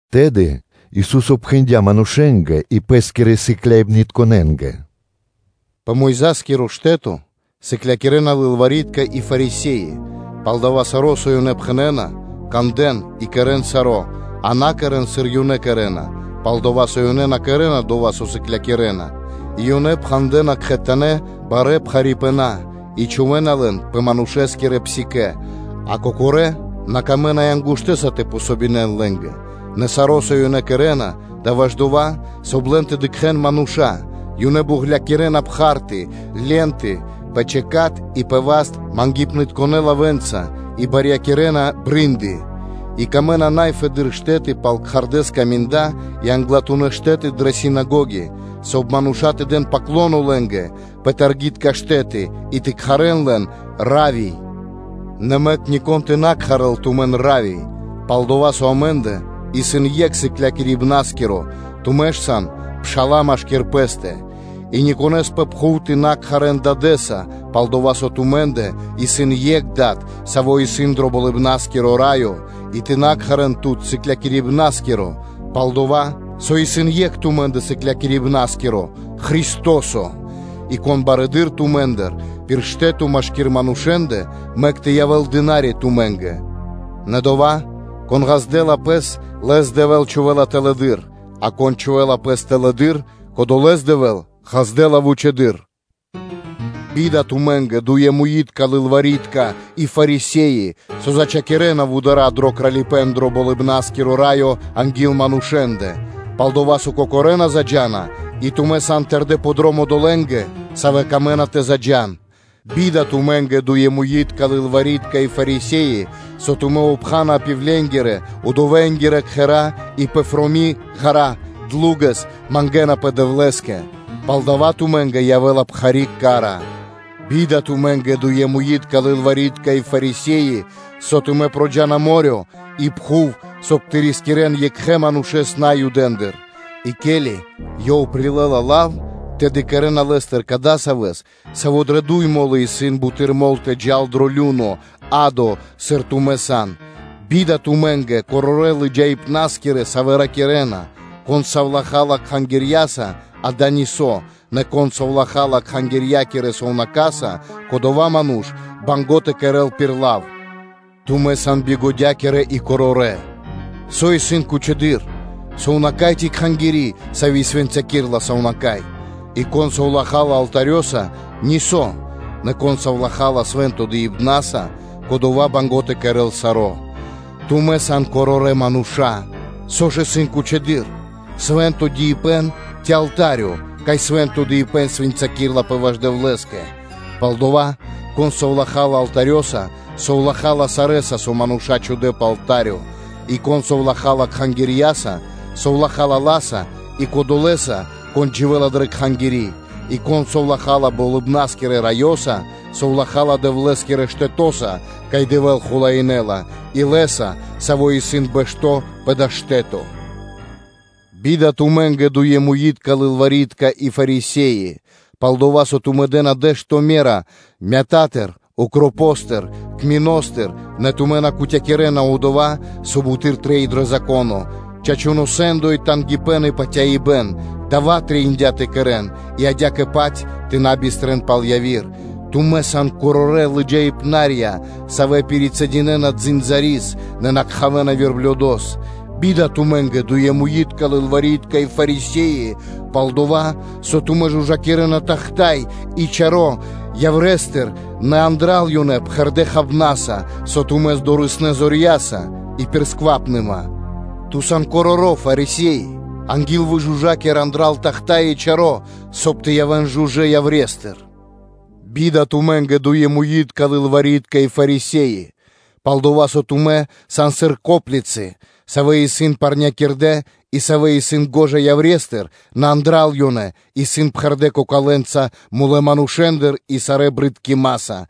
Тэды Ису́со пхэндя́ манушэ́нгэ и Пэ́скирэ сыкляибнытконэ́нгэ: “Пэ Мойза́скиро штэ́то сыклякирэ́на лылвари́тка и Фарисе́и; палдава́ саро́, со ёнэ пхэнэ́на, кандэ́н и кэрэ́н саро́, а на кэрэ́н, сыр ёнэ кэрэ́на; пал-дова́ со ёнэ на кэрэ́на дова́, со ёнэ сыклякирэ́на, и ёнэ пхандэна кхэтанэ́ барэ́ пхарипэна и чхувэ́на лэн пэ манушэ́нгирэ псикэ́, а кокорэ́ на камэ́на и ангуштэса тэ дэн васт лэ́нгэ. Нэ саро́, со ёнэ кэрэ́на, – дава́ ваш дова́, соб (кай) лэн тэ дыкхэ́н мануша́: ёнэ буґлякирэна пхарты (ленты) пэ чикат и пэ васт мангипнытконэ лавэ́нца и барьякирэна брынды (фальбонки), и выкэдэна най фэдэды́р штэ́ты пал кхардэ́ скаминда и англатунэ́ штэ́ты дрэ синагоги, соб (кай) мануша́ тэ дэн ‘паклоно’ лэ́нгэ пэ таргитка штэ́ты и тэ кхарэ́н лэн ‘Равви’; нэ мэк нико́н тэ на кхарэл тумэн ‘Равви’; пал-дова́ со амэ́ндэ исын екх Сыклякирибна́скиро, тумэ́ ж сан пша́ла машки́р пэ́стэ. И никонэ́с пэ пхув тэ на кхарэ́н ‘дадэ́са’, пал-дова́ со тумэ́ндэ исын екх Дад, Саво́ исын дро Болыбна́скиро Раё. И тэ на кхарэ́н тут ‘сыклякирибна́скиро’; пал-дова́ со исын екх тумэ́ндэ Сыклякирибна́скиро Христо́со. И кон барэды́р тумэ́ндыр пир штэ́то машки́р манушэ́ндэ, мэк тэ явэ́л дына́ри тумэ́нгэ. Нэ дова́, кон ґаздэ́ла пэс, лэс Дэвэ́л чхувэ́ла тэлэды́р, а кон чхувэ́ла пэс тэлэды́р, кодолэ́с Дэвэ́л ґаздэ́ла вучэды́р. Бида тумэ́нгэ, дуемуитка лылвари́тка и Фарисе́и, савэ́ зачхакирэна вудара́ дро Кралипэ́н дро Болыбна́скиро Раё анги́л манушэ́ндэ; пал-дова́ со тумэ́ кокорэ́ на заджа́на, и тумэ́ сан тэрдэ́ пэ дром одолэ́ндэ, савэ́ камэ́на тэ заджа́н. Бида тумэ́нгэ, дуемуитка лылвари́тка и Фарисе́и, со тумэ́ обхана пивленгирэ (удовэнгирэ) кхэра́ и пэфроми ґара́ (длу́гэс) мангэ́напэ Дэвлэ́скэ: пал дава́ тумэ́нгэ явэ́ла пхари́ ка́ра. Бида тумэ́нгэ, дуемуитка лылвари́тка и Фарисе́и, со тумэ́ проджа́на мо́рё (дэрья́в) и пхув, соб (кай) тэ рискирэ́н екхэ манушэ́с тэ патял Наюдэндыр: и ке́ли ёв прилэ́ла лав, тэды кэрэ́на лэ́стыр кадасавэс, саво́ дрэ дуй мо́лы исын буты́р мол тэ джал дро лю́но (адо), сыр тумэ́ сан. Бида тумэ́нгэ, корорэ́ лыджаибна́скирэ, савэ́ ракирэ́на: ‘Кон совлахала кхангирьяса, дава́ исын нисо́; нэ кон совлахала кхангирья́кирэ сувнака́са, кодова́ ману́ш исын банго́ тэ кэрэ́л пир лав.’ Тумэ́ сан бигодякирэ и корорэ́, со исын кучэдыр: сувнака́й ци кхангири́, сави́ свэнцякирэла сувнака́й? И, ‘кон совлахала алтарёса нисо́, нэ кон совлахала свэнтонэ́ дыибнаса, кодова́ исын банго́ тэ кэрэ́л саро́.’ Тумэ́ сан корорэ́ мануша́! Со ж исын кучэдыр: свэ́нто дыибэ́н ци алта́рё, кай свэ́нто дыибэ́н свэнцякирэлапэ ваш Дэвлэ́скэ? Палдава́, кон совлахала алтарёса, совлахала сарэ́са, со мануша́ чхудэ́ пэ алта́рё; И кон совлахала кхангирьяса, совлахала ла́са и Кодолэса, Кон дживэ́ла дрэ кхангири́. И кон совлахала Болыбна́скирэ Раёса, совлахала Дэвлэ́скирэ штэтоса, кай Дэвэ́л хулаинэла, и Лэ́са, Саво́ исын бэшто́ пэ дава́ штэ́то. Бида тумэ́нгэ, дуемуитка лылвари́тка и Фарисе́и: пал-дова́ со тумэ́ дэ́на дэ́што ме́ра мятатыр, укропостыр, кминостыр, нэ тумэ́ на кутякирэна дова́, со буты́р трэй дро Зако́но: чачуно́ сэ́ндо и тангипэ́н и патяибэ́н: дава́ трэиндя́ тэ кэрэ́н и адя́кэ-паць тэ на бистрэн пал яви́р. Тумэ́ сан корорэ́ лыджаипнарья, савэ́ пирицэдинэна дзындзарис (комарос), нэ накхавэна верблюдос! Бида тумэ́нгэ, дуемуитка лылвари́тка и Фарисе́и: пал-дова́ со тумэ́ жужакирэна тахта́й (чаша) и чаро́ яврестыр, нэ андра́л ёнэ сыкавэ́на тумари́ бокх кэ чу́жо миштыпэ́н и сквапныма. Ту сан короро́ Фарисеё! Анги́л выжужакир андра́л тахта́й и чаро́, соб (кай) тэ явэ́н жужэ́ яврестыр. Бида тумэ́нгэ, дуемуитка лылвари́тка и Фарисе́и: пал-дова́ со тумэ́ сан сыр коплицы, савэ́ исын парнякирдэ и савэ́ исын гожа яврестыр, нэ андра́л ёнэ исын пхэрдэ́ кокалэнца мулэ́ манушэ́ндыр и сарэ́ джунгалыпнаса (брыдкимаса).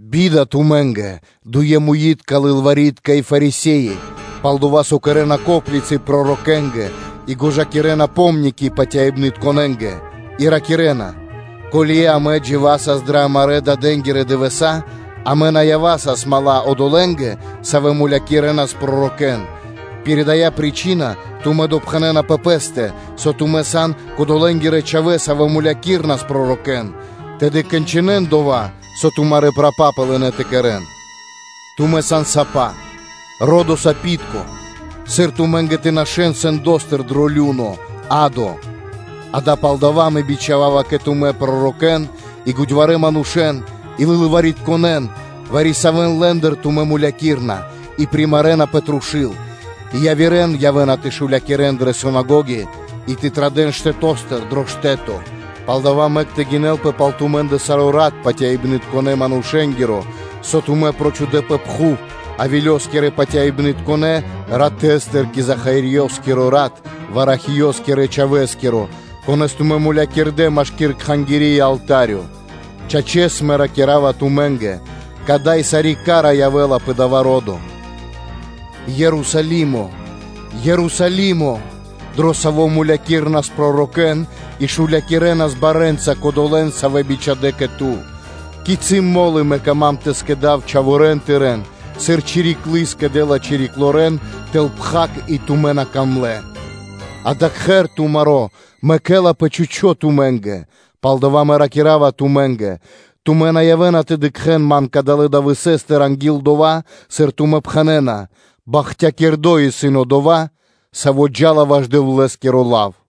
Бида тумэ́нгэ, дуемуитка лылвари́тка и Фарисе́и, пал-дова́ со кэрэ́на коплицы пророкэнгэ и гожакирэна помники патяибнытконэнгэ, и ракирэ́на: ‘Ко́ли амэ дживасас дрэ амарэ́ дадэнги́рэ дывэса́, амэ на явасас мала́ одолэ́нгэ, савэ́ мулякирэнас пророкэ́н.’ Пир дая́ причына тумэ́ допхэнэна пэ пэ́стэ, со тумэ́ сан кодолэнгирэ чхавэ́, савэ́ мулякирэнас пророкэ́н: тэды кончынэн дава́, со тумарэ́ прапапы лынэ́ тэ кэрэ́н. Тумэ́ сан сапа, ро́до сапитко, сыр тумэ́нгэ тэ нашэ́н сэндостыр дро лю́но (адо)? Акэ, палдава́ Мэ бичхава́ва кэ тумэ́ пророкэ́н и годьварэ́ манушэ́н и лылваритконэн; вари-савэ́н лэ́ндыр тумэ́ мулякирэна и примарэна пэ трушу́л, и явирэ́н явэ́на тэ шулякирэн дрэ синагоги и традэ́н штэто́стыр пэ штэ́то; палдава́ мэк тэ гинэлпэ пал тумэ́ндэ саро́ рат патяибнытконэ манушэ́нгиро, со тумэ́ прочхудэ пэ пхув: Авелёскирэ патяибнытконэ ратэстыр кэ Захариёскиро рат, Варахиёскирэ чхавэ́скиро, конэ́с тумэ́ мулякирдэ́, машки́р Кхангири́ и алта́рё. Чачэс, Мэ ракира́ва тумэ́нгэ: кадай сари́ ка́ра явэ́ла пэ дава́ ро́до. Ерусалимэ! Ерусалимэ! Дро саво́ мулякирэнас пророкэ́н и шулякирэнас барэ́нца кодолэ́н, савэ́н бичхадэ́ кэ ту. Кицы́ мо́лы Мэ кама́м тэ скэдав чхаворэ́н тырэ́н, сыр чириклы скэдэ́ла чириклорэн тэл пхак и тумэ́ на камлэ́! Акэ, кхэр тумаро́ мэкэлапэ чхучо́ (пусто) тумэ́нгэ. Палдава́ Мэ ракира́ва тумэ́нгэ: тумэ́ на явэ́на тэ дыкхэ́н Ман кадалэ́ дывэсэ́стыр анги́л дова́, сыр тумэ́ пхэнэ́на: ‘Бахтякирдо́ исын Одова́, Саво́ джа́ла ваш Дэвлэ́скиро лав.’”